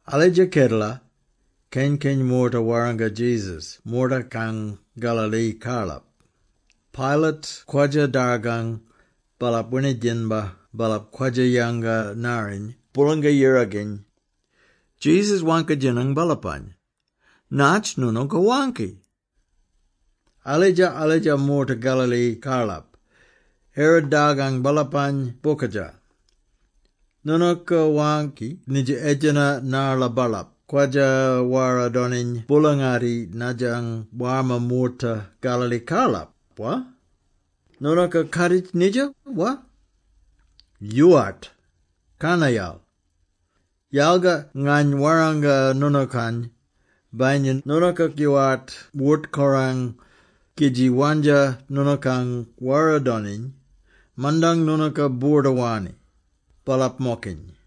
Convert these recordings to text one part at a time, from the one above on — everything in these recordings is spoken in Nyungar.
Alidja kedela, keny-keny moorta warranga Jesus moortakang Galilee-karlap. Pilate kwadja-dargang baalap winidjinbar baalap kwadja-yanga-narriny Boolanga-Yirakany. Jesus waangki-djinang baalapany, “Natj noonooka waangki? Alidja-alidja moorta Galilee-karlap, Herod dargang baalapany bokadja. Noonooka waangki nidja edjena narla baalap kwadja-wara-doniny boola-ngatti nadjang warma moorta Galilee-karlap, wa? Noonooka kaaditj nidja, wa? Yoowart, karnayal! Yalga ngany warranga noonookany, bayinya noonooka yoowart wort-korang, kidji wandja noonookang wara-doniny, mandang noonooka boorda-wanni, baalap-mokiny.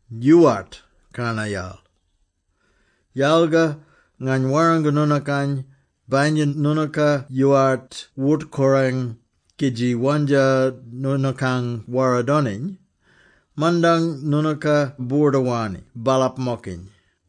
Yoowart, karnayal! Yalga ngany warranga noonookany, bayinya noonooka yoowart wort-korang, kidji wandja noonookang wara-doniny, mandang noonooka boorda-wanni, baalap-mokiny.”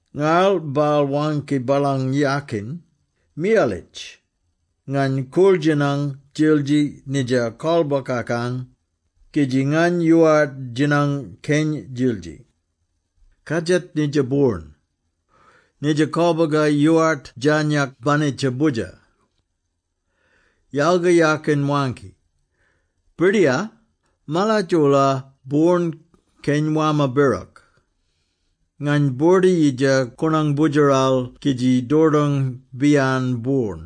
Ngarl baal waangki baalang yakin, ‘Miyalitj! Ngany koorl-djinang djildji nidja kolbokakang, kidji ngany yoowart djinang keny djildji. Kadjat nidja boorn! Nidja kolboga yoowart djarnyak banitja boodjer.’ Yalga yakin waangki, ‘Birdiyar, maladj-oola boorn keny warma birok. Ngany boorda-yidja koonang boodjeral kidji dordong-biyan boorn.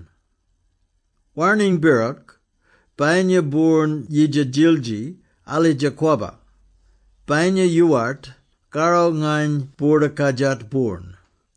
Warning birok, bayinya boorn yidja djildji, alidja kwabba; bayinya yoowart, karro nyany boorda-kadjat boorn.’”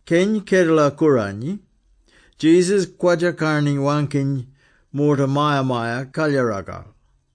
Keny Kedela-Kooranyi, Jesus kwadja-karni-waangkiny moorta Maya-Maya-Kalyaragal.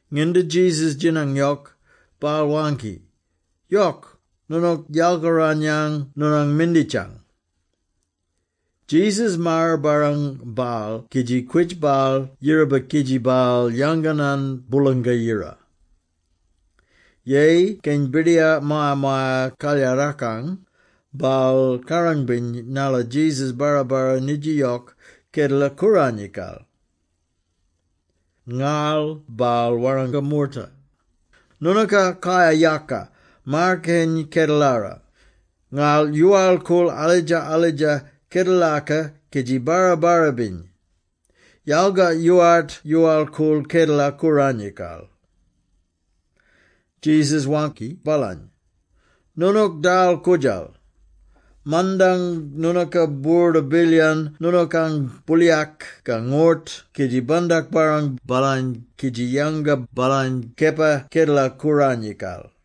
Nginda Jesus djinang yok, baal waangki, “Yok, noonook yalkaran-yan noonang minditjang!” Jesus maar-barrang baal kidji kwitj baal yiraba kidji baal yanganan Boolanga-Yira. Yeyi keny birdiyar Maya-Maya-Kalyarakang, baal kaarang-biny narla Jesus barra-barra nidja yok Kedela-Kooranyikal. Ngarl baal warranga moorta, “Noonooka kayar-yaka maar-keny kedelara; ngarl yoowal-koorl alidja-alidja kedelaka kidji barra-barra-biny; yalga yoowart yoowal-koorl Kedela-Kooranyikal!” Jesus waangki baalany, “Noonook dal-koodjal! Mandang noonooka boorda-bilyan noonookang booliyak ka ngort kidji bandak-barrang baalany kidji yanga baalany kepa Kedela-Kooranyikal.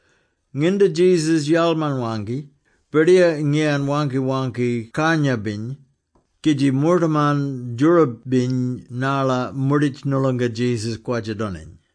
Nginda Jesus yalman-waangki, birdiyar ngiyan waangki-waangki karnya-biny, kidji moortaman djoorab-biny narla moorditj noolonga Jesus kwadja-doniny.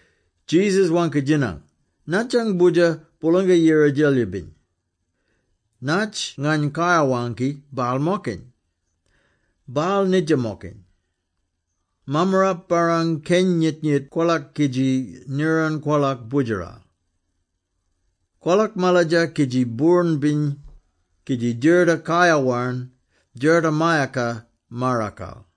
Jesus waangki-djinang, “Natjang Boodjer Boolanga-Yira Djelyibiny? Natj ngany kayar-waangki baal-mokiny? Baal nidja-mokiny. Mammarap barrang keny nyit-nyit kwolak kidji niran kwolak boodjeral. Kwolak maladja kidji boorn-biny, kidji djerta kayar-warn djertamayaka maarakal!”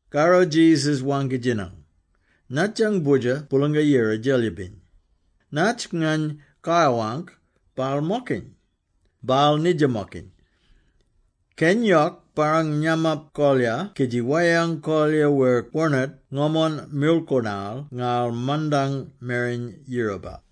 Karro Jesus waangki-djinang, “Natjang Boodjer Boolanga-Yira Djelyibiny? Natj ngany kayar-waangk baal-mokiny? Baal nidja-mokiny. Keny yok barrang nyamap kolyar kidji weyang kolyar wer kwonert ngomon mirlkoonal ngarl mandang mereny yiraba.”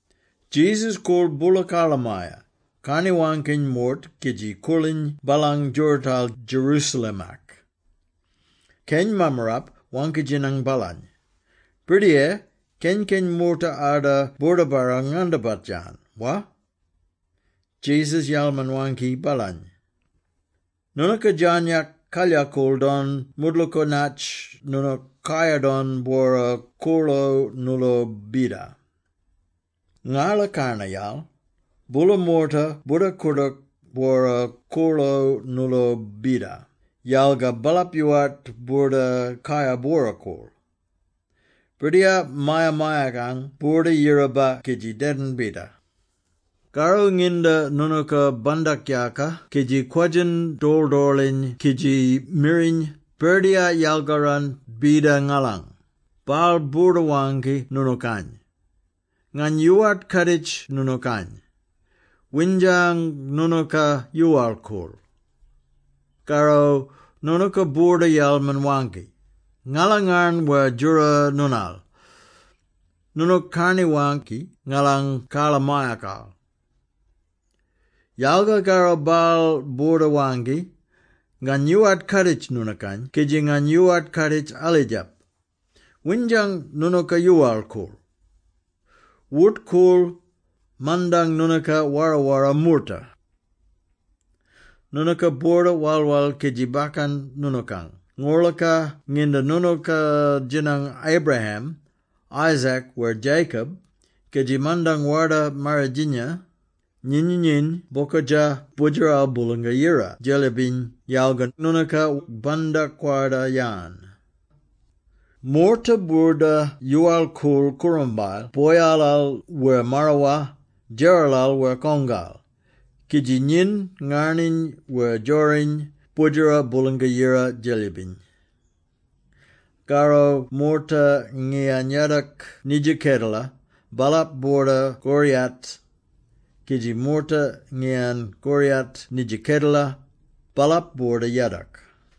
Jesus koorl boola karlamaya, karni-waangkiny moort kidji koorliny baalang djoorootal Jerusalem-ak. Keny mammarap waangki-djinang baalany, “Birdiyar, keny-keny moorta arda boordabarrang-ngandabat-yan, wa?” Jesus yalman-waangki baalany, “Noonooka djarnyak kalyakool don moodlooka natj noonook kayar-don bwora-koorlo nooloo bida. Ngarla karnayal, boola moorta boorda-koordook bwora-koorlo nooloo bida, yalga baalap yoowart boorda kayar bwora-koorl. Birdiyar maya-mayakang boorda-yiraba kidji dedin bida. Karro nginda noonooka bandak-yaaka kidji kwadjin dorl-dorliny kidji miriny ‘Birdiyar, yalgaran bida ngalang!’ baal boorda-waangki noonookany, ‘Ngany yoowart kaaditj noonookany. Windjang noonooka yoowal-koorl!’ Karro noonooka boorda-yalman-waangki, ‘Ngala ngarn wer djora noonal; noonook karni-waangki ngalang karlamayakal!’ Yalga karro baal boorda-waangki, ‘Ngany yoowart kaaditj noonookany kidji ngany yoowart kaaditj alidjap, windjang noonooka yoowal-koorl. Wort-koorl, mandang noonooka wara-wara moorta!’ “Noonooka boorda-wal-wal kidji bakkan noonookang ngorlaka nginda noonooka djinang Abraham, Isaac wer Jacob, kidji mandang Warda-Marridjinya, nyinyiny bokadja Boodjeral Boolanga-Yira Djelyibiny yalga noonooka bandak-kwarda-yan. Moorta boorda-yoowal-koorl koorambayel - boyalal wer marawar, djeralal wer kongal - kidji nyin ngarniny wer djoriny Boodjera Boolanga-Yira Djelyibiny. Karro moorta ngiyan yadok nidja kedela, baalap boorda koriyat, kidji moorta ngiyan koriyat nidja kedela, baalap boorda yadok.”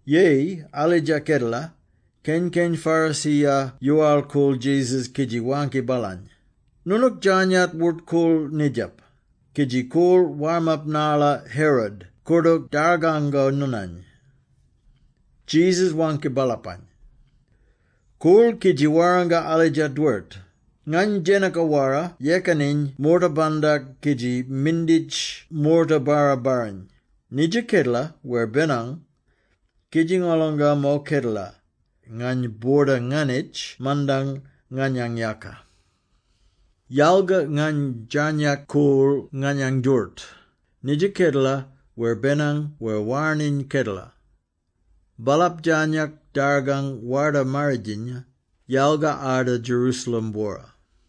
Yeyi alidja kedela, keny-keny Pharisee-ya yoowal-koorl Jesus kidji waangki baalany, “Noonook djarnyak wort-koorl nidjap, kidji koorl warmap narla Herod koordook dargango noonany.” Jesus waangki baalapany, “Koorl kidji warranga alidja dwert, ‘Ngany djenaka-wara yekaniny moorta-bandak kidji minditj moorta barra-barriny, nidja kedela wer benang, kidji ngolonga mo kedela, ngany boorda-nganitj mandang nganyang yaka.’” Yalga ngany djarnyak koorl nganyang djooroot, nidja kedela wer benang wer warning kedela. Baalap djarnyak dargang Warda-Marridjinya, yalga arda Jerusalem-bwora.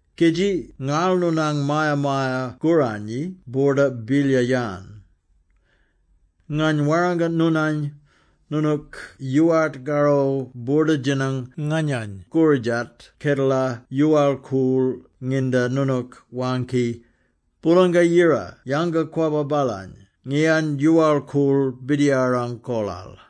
Kidji ngarl noonang Maya-Maya-Kooranyi boorda-bilyar-yan. Ngany warranga noonany, noonook yoowart karro boorda-djinang nganyany koridjat kedela yoowal-koorl nginda noonook waangki, ‘Boolanga-Yira yanga-kwabba baalany ngiyan yoowal-koorl Birdiyarang kolal.’”